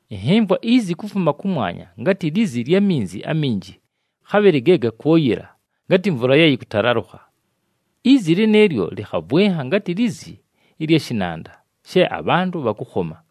Ɨnhɨmvwa izi kufuma kʉmwanya, ngatɨ lizi lya minzi aminji, khabhɨlɨ ge gakwʉyɨla ngatɨ mvula ye yɨkʉtalalʉkha. Izi lɨnɨɨlyo lɨkhavwɨnha ngatɨ lizi lya shɨnanda, she abhantʉ bhakʉkhoma.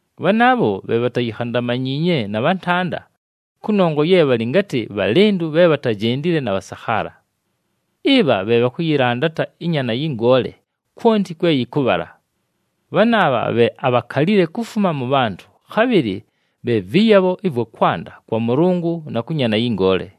Bhanaabho bhe bhatayikhandamanyiinye na bhantanda, kʉnongwa ye bhalɨ ngatɨ bhalɨndʉ bhe bhatajendile na bhasakhaala. Ɨbha bhe bhakʉyɨlandata ɨNyaana yɨ Ngoole kwonti kwe yɨkʉbhala. Bhanaabha bhe abhakalile kufuma mʉ bhantʉ, khabhɨlɨ bhe vɨyabho ɨvwa kwanda kwa Mʉlʉngʉ na kʉ Nyaana yɨ Ngoole.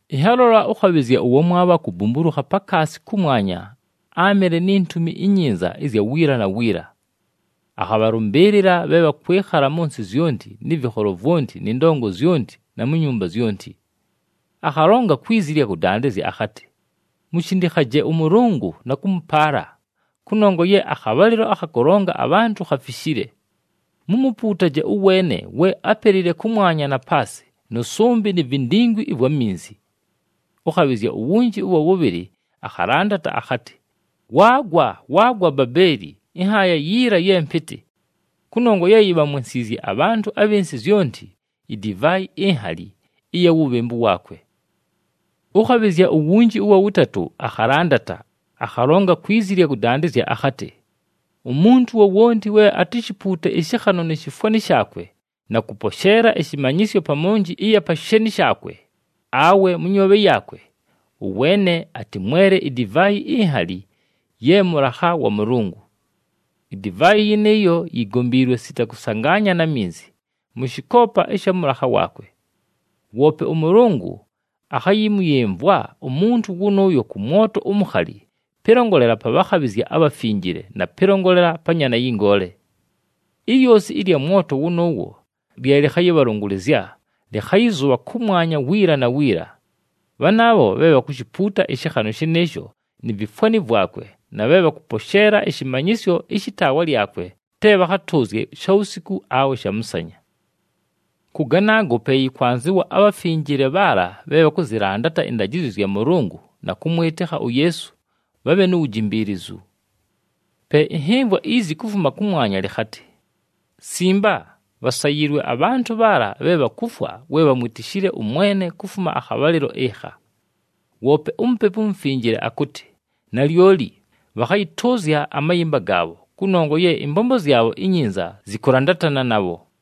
Ɨnhalola ʉkhabhɨzya ʉwamwabho akubumbulukha pakaasi kʉmwanya, áamɨle ni Ntumi iNyinza ɨzya wiila na wiila. Akhabhalʉmbɨɨlɨla bhe bhakwɨkhala mʉ nsɨ zyonti, nɨ vɨkholo vwonti, nɨ ndongo zyonti, na mu nyumba zyonti. Akhalonga kwi zi ɨlya kʉdandɨzya akhatɨ, “Mushindikhaje ʉMʉlʉngʉ na kʉmʉpaala, kʉnongwa ye akhabhalɨlo akha kʉlonga abhantʉ khafishile. Mumupuutaje ʉweene we ápelile kʉmwanya na paasɨ nʉ sʉmbɨ ni vindingwi ɨvwa minzi.” Ʉkhabhɨzya uwunji ʉwa wʉbhɨlɨ akhalandata, akhatɨ, “Waagwa, waagwa Babeeli, ɨnhaaya yiila ye mpɨtɨ! Kʉnongwa ye yibhamwensiizye abhantʉ abhɨ nsɨ zyonti idivaayi inhali ɨya wubhembu waakwe.” Ʉkhabhɨzya uwunji ʉwa wʉtatʉ akhalandata, akhalonga kwi zi ɨlya kʉdandɨzya akhatɨ, “Umuntu wowonti we atishipuute ɨshɨkhanʉ ni shifwani shaakwe, na kʉposheela ɨshɨmanyɨsyo pa monji ɨya pa sheeni shaakwe, awe mʉ nyoobhe yaakwe, ʉweene atɨmwele idivaayi inhali ye mʉlakha wa Mʉlʉngʉ. Idivaayi yɨnɨɨyo yigombiilwe sita kʉsangaanya na minzi, mʉ shɨkoopa ɨsha mʉlakha waakwe. Woope ʉMʉlʉngʉ akhayɨmʉyɨmvwa umuntu wʉnʉʉyo kʉ mwoto umukhali pɨlongolela pa bhakhabhɨzya abhafinjile, na pɨlongolela pa Nyaana yɨ Ngoole. Ilyosi ɨlya mwoto wʉnʉʉwo lye lɨkhayɨbhalʉngʉlɨzya lɨkhayɨzʉbha kʉmwanya wiila na wiila. Bhanaabho bhe bhakushipuuta ɨshɨkhanʉ shɨnɨɨsho ni vifwani vwakwe na bhe bhakʉposheela ɨshɨmanyɨsyo ɨshɨ taawa lyakwe te bhakhatʉʉzye shawusiku awe shamʉsanya.” Kʉ ganaago pe yɨkwanzɨwa abhafinjile bhaala bhe bhakʉzɨlandata ɨndajɨzyo zya Mʉlʉngʉ na kʉmwɨtɨkha uYeesu, bhabhe nu wujimbiilizu. Pe ɨnhɨmvwa izi kufuma kʉmwanya, lɨkhatɨ, “Simba! Bhasayiilwe abhantʉ bhaala bhe bhakufwa we bhamwitishile ʉMwene kufuma akhabhalɨlo ɨkha.” Woope uMupepu uMufinjile akʉtɨ, “Nalyoli! Bhakhayɨtʉʉzya amayɨmba gaabho, kʉnongwa ye ɨmbombo zyabho inyinza zɨkʉlandatana nabho.”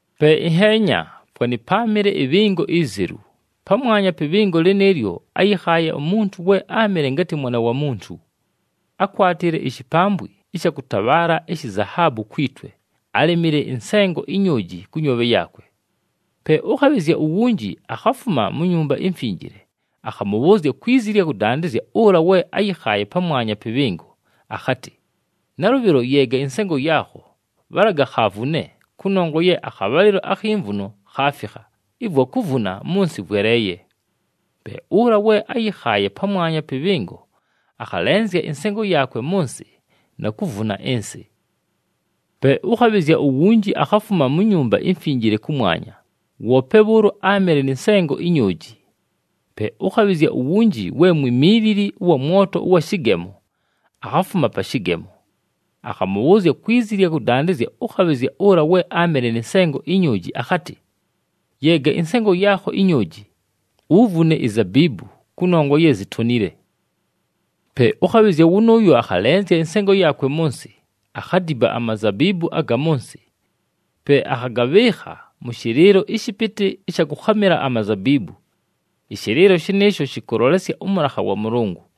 Pe ɨnheenya, fwanɨ páamɨle ɨbhɨngo izelu. Pamwanya pɨ bhɨngo lɨnɨɨlyo áyɨkhaaye umuntu we áamɨle ngatɨ Mwana wa Muntu. Ákwatile ishipambwi ɨsha kʉtabhaala ishi zahaabu kwi twe, álemile ɨnsengo inyooji kʉ nyoobhe yaakwe. Pe ʉkhabhɨzya uwunji akhafuma mu Nyumba iMfinjile, akhamʉbhʉʉzya kwi zi ɨlya kʉdandɨzya ʉla we áyɨkhaaye pamwanya pɨ bhɨngo, akhatɨ, “Nalʉbhɨlo, yeega ɨnsengo yaakho, bhalaga khavune, kʉnongwa ye akhabhalɨlo akhi mvuno khaafikha, ɨvwa kuvuna mʉ nsɨ vweleeye.” Pe ʉla we áyɨkhaaye pamwanya pɨ bhɨngo akhalenzya ɨnsengo yaakwe mʉ nsɨ na kuvuna ɨnsɨ. Pe ʉkhabhɨzya uwunji akhafuma mu Nyumba iMfinjile kʉmwanya, woope bhʉʉlo áamɨle nɨ nsengo inyooji. Pe ʉkhabhɨzya uwunji we mwimiilili ʉwa mwoto ʉwa shɨgemo, akhafuma pa shɨgemo. Akhamʉbhʉʉzya kwi zi ɨlya kʉdandɨzya ʉkhabhɨzya ʉla we áamɨle nɨ nsengo inyooji akhatɨ, “Yeega ɨnsengo yaakho inyooji. Uvune izabiibu, kʉnongwa ye zitonile.” Pe ʉkhabhɨzya wʉnʉʉyo akhalenzya ɨnsengo yaakwe mʉ nsɨ, akhadiba amazabiibu aga mʉ nsɨ. Pe akhagabhɨɨkha mʉ shɨlɨɨlo ɨshɨpɨtɨ ɨsha kʉkhamɨla amazabiibu. Ɨshɨlɨɨlo shɨnɨɨsho shɨkʉlolesya ʉmʉlakha wa Mʉlʉngʉ.